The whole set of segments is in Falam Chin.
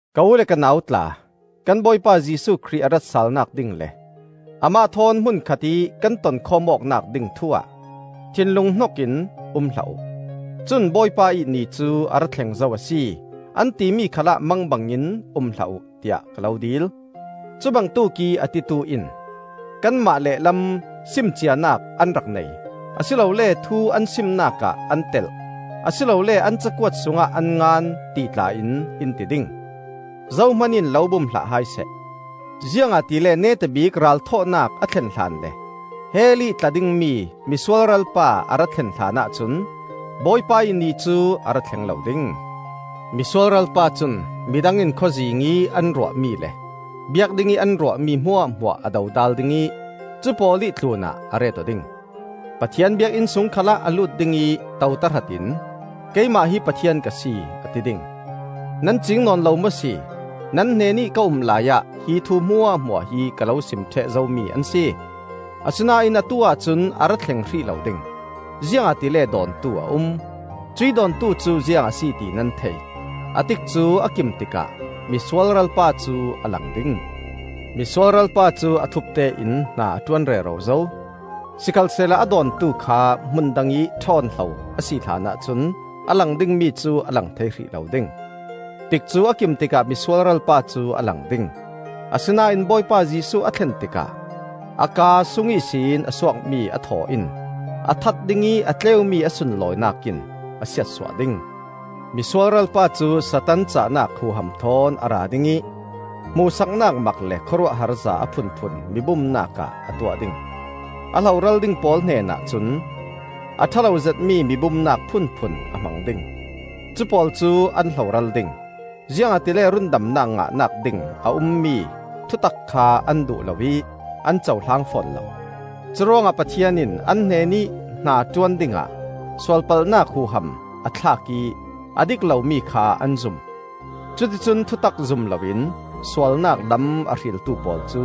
Ka u le ka nau tla, kan Bawipa Jesuh Khrih a ratsalnak ding le amah thawn hmun khatih kan tonkhawm awknak ding thu-ah, thinlung hnokin um hlah uh; cun Bawipa ih Ni cu a ra thleng zo a si, an timi khalah mangbangin um hlah uh, tiah ka lo dil. Cubangtuk ih a titu in kanmah lehlam, sim cianak an rak nei, a si lole thu an simnak ah an telh, a si lole an cakuat sungah an ngan, ti tla-in in ti ding. Zohman in lo bum hlah hai seh. Ziangahtile neta bik Ralthawhnak a thlen hlan le hell ih tla dingmi Misualral pa a ra thlen hlanah cun Bawipa ih Ni cu a ra thleng lo ding. Misualral pa cun midang in khawzing ih an ruahmi le biak dingih an ruahmi hmuahhmuah a dodal ding ih cu pawl ih tlunah a ret-aw ding. Pathian Biakinn sung khalah a lut ding ih to tahratin keimah hi Pathian ka si, a ti ding. Nan ciing nawn lo maw si? Nan hnenih ka um laiah hi thu hmuahhmuah hi ka lo sim ṭheh zomi an si. Asinain atu-ah cun a ra thleng hrih lo ding, ziangahtile dawntu a um. Cuih dawntu cu ziang a si ti nan thei. A tikcu a kim tikah Misualral pa cu a lang ding. Misualral pa cu a thupte in hna a ṭuan rero zo; sikhalsehla a dawntu kha hmun dangih ṭhawn hlo a si hlanah cun a lang dingmi cu a lang thei hrih lo ding. Tikcu a kim tikah Misualral pa cu a lang ding. Asinain Bawipa Jesuh a thlen tikah a kaa sung ihsin a suakmi a thaw in a that ding ih a tleumi a sunlawinak in a siatsuah ding. Misualral pa cu Satan cahnak huham thawn a ra ding ih hmuhsaknak mak le khawruahharza a phunphun mi bumnak ah a tuah ding. A hloral ding pawl hnenah cun a ṭha lo zetmi mibumnak phunphun a hmang ding. Cu pawl cu an hloral ding, ziangahtile rundamnak ngahnak ding a ummi thutak kha an duh lo ih an cohlang fawn lo. Curuangah Pathian in an hnenih hnaṭuan dingah sualpalhnak huham a thlak ih a dik lomi kha an zum. Cuticun thutak zum loin sualnak lam a hriltu pawl cu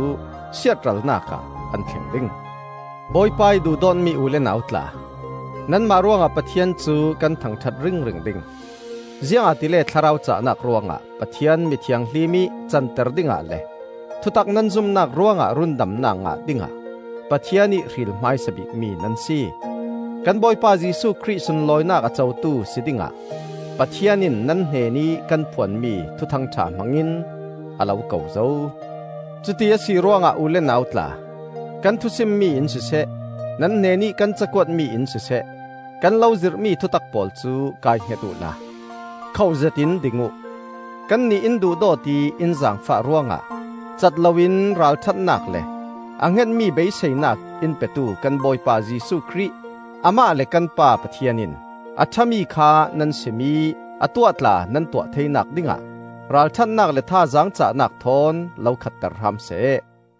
siatralnak ah an thleng ding. Bawipa ih duhdawtmi u le nau tla, nanmah ruangah Pathian cu kan thangṭhat ringring ding. Ziangahtile Thlarau cahnak ruangah Pathian mi thianghlim ih canter dingah le thutak nan zumnak ruangah rundamnak ngah dingah Pathian ih hril hmaisa bikmi nan si. Kan Bawipa Jesuh Khrih sunlawinak a cotu si dingah Pathian in nan hnenih kan phuanmi Thuthangṭha hmangin a lo ko zo. Cuti a si ruangah u le nau tla, kan thusimmi in siseh, nan hnenih kan cakuatmi in siseh, kan lo zirhmi thutak pawl cu kaihnget uhla khohzetin ding uh. Kannih in duhdawt ih in zaangfah ruangah cat loin ralṭhatnak le a hngetmi beiseinak in petu kan Bawipa Jesuh Khrih Amah le kan Pa Pathian in, a ṭhami kha nan sim ih a tuah tla nan tuah theinak dingah ralṭhatnak le thazaang cahnak thawn lo khatter hram seh.